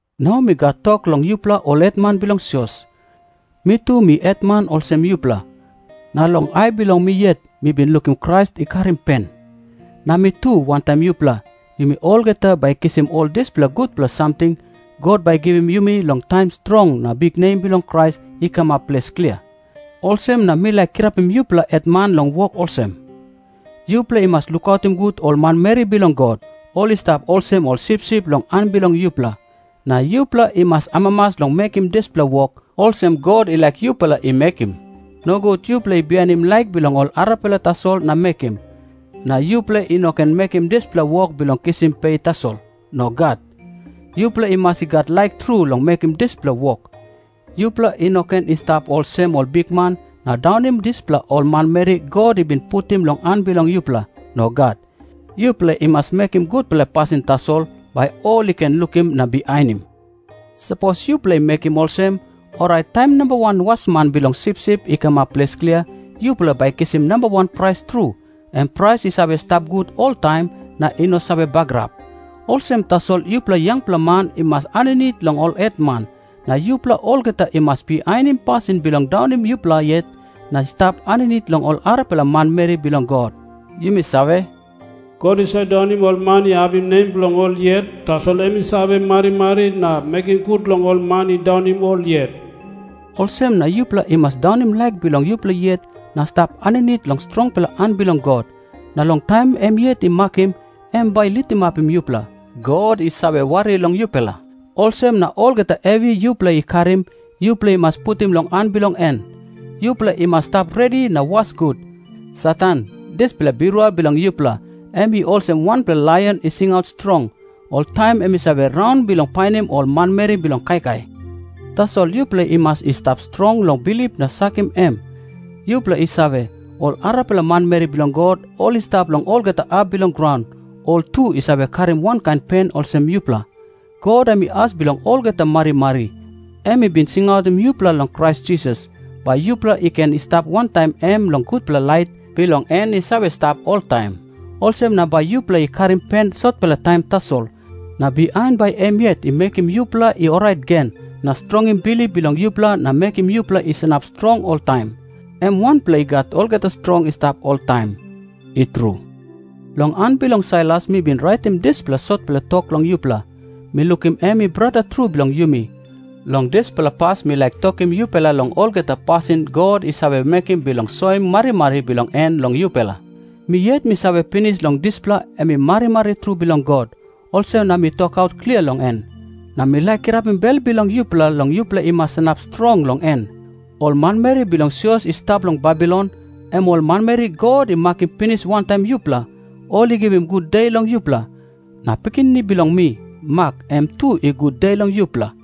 Nau mi gat tok long yupela ol hetman bilong sios. Mi tu mi hetman olsem yupela, na long ai bilong mi yet mi bin lukim Krais i karim pen. Na mi tu wantaim yupela, yumi olgeta bai i kisim ol dispela gutpela samting God bai i givim yumi long taim strong na biknem bilong Krais i kamap ples klia. Olsem na mi laik kirapim yupela hetman long wok olsem. Yupela i mas lukautim gut ol manmeri bilong God. Ol i stap olsem ol sipsip long han bilong yupela. Na yupela i mas amamas long mekim dispela wok, olsem God i laik yupela i mekim. Nogut yupela i bihainim laik bilong ol arapela tasol na mekim. Na yupela i no ken mekim dispela wok bilong kisim pe tasol. Nogat. Yupela i mas i gat laik tru long mekim dispela wok. Yupela i no ken i stap olsem ol bikman na daunim dispela ol manmeri God i bin putim long han bilong yupela. Nogat. Yupela i mas mekim gutpela pasin tasol, bai ol i ken lukim na bihainim. Sapos yupela i mekim olsem, orait taim Namba Wan Wasman bilong sipsip i kamap ples klia, yupela bai i kisim nambawan prais tru, em prais i save stap gut oltaim, na i no save bagarap. Olsem tasol yupela yangpela man i mas aninit long ol hetman. Na yupela olgeta i mas bihainim pasin bilong daunim yupela yet na i stap aninit long ol arapela manmeri bilong God. Yumi save, “God i save daunim ol man i apim nem bilong ol yet, tasol em i save marimari na mekim gut long ol man i daunim ol yet.” Olsem na yupela i mas daunim laik bilong yupela yet na stap aninit long strongpela han bilong God. Na long taim em yet i makim, em bai i litimapim yupela. God i save wari long yupela. Olsem na olgeta hevi yupela i karim, yupela i mas putim long han bilong en. Yupela i mas stap redi na was gut. Satan, dispela birua bilong yupela, em i olsem wanpela laion i singaut strong. Oltaim em i save raun bilong painim ol manmeri bilong kaikai. Tasol yupela i mas i stap strong long bilip na sakim em. Yupela i save, ol arapela manmeri bilong God, ol i stap long olgeta hap bilong graun, ol tu i save karim wankain pen olsem yupela. God em i as bilong olgeta marimari. Em i bin singautim yupela long Krais Jisas, bai yupela i ken i stap wantaim em long gutpela lait bilong en i save stap oltaim. Olsem na bai yupela i karim pen sotpela taim tasol, na bihain bai em yet i mekim yupela i orait gen, na strongim bilip bilong yupela na mekim yupela i sanap strong oltaim. Em wanpela i gat olgeta strong i stap oltaim. I tru. Long han bilong Sailas mi bin raitim dispela sotpela tok long yupela. Mi lukim em i brata tru bilong yumi. Long dispela pas mi laik tokim yupela long olgeta pasin God i save mekim bilong soim marimari bilong en long yupela. Mi yet mi save pinis long dispela em i marimari tru bilong God, olsem na mi tokaut klia long en. Na mi laik kirapim bel bilong yupela long yupela i mas sanap strong long en. Ol manmeri bilong sios i stap long Babilon, em ol manmeri God i makim pinis wantaim yupela, ol i givim gude long yupela. Na pikinini bilong mi, Mak, em tu i gude long yupela.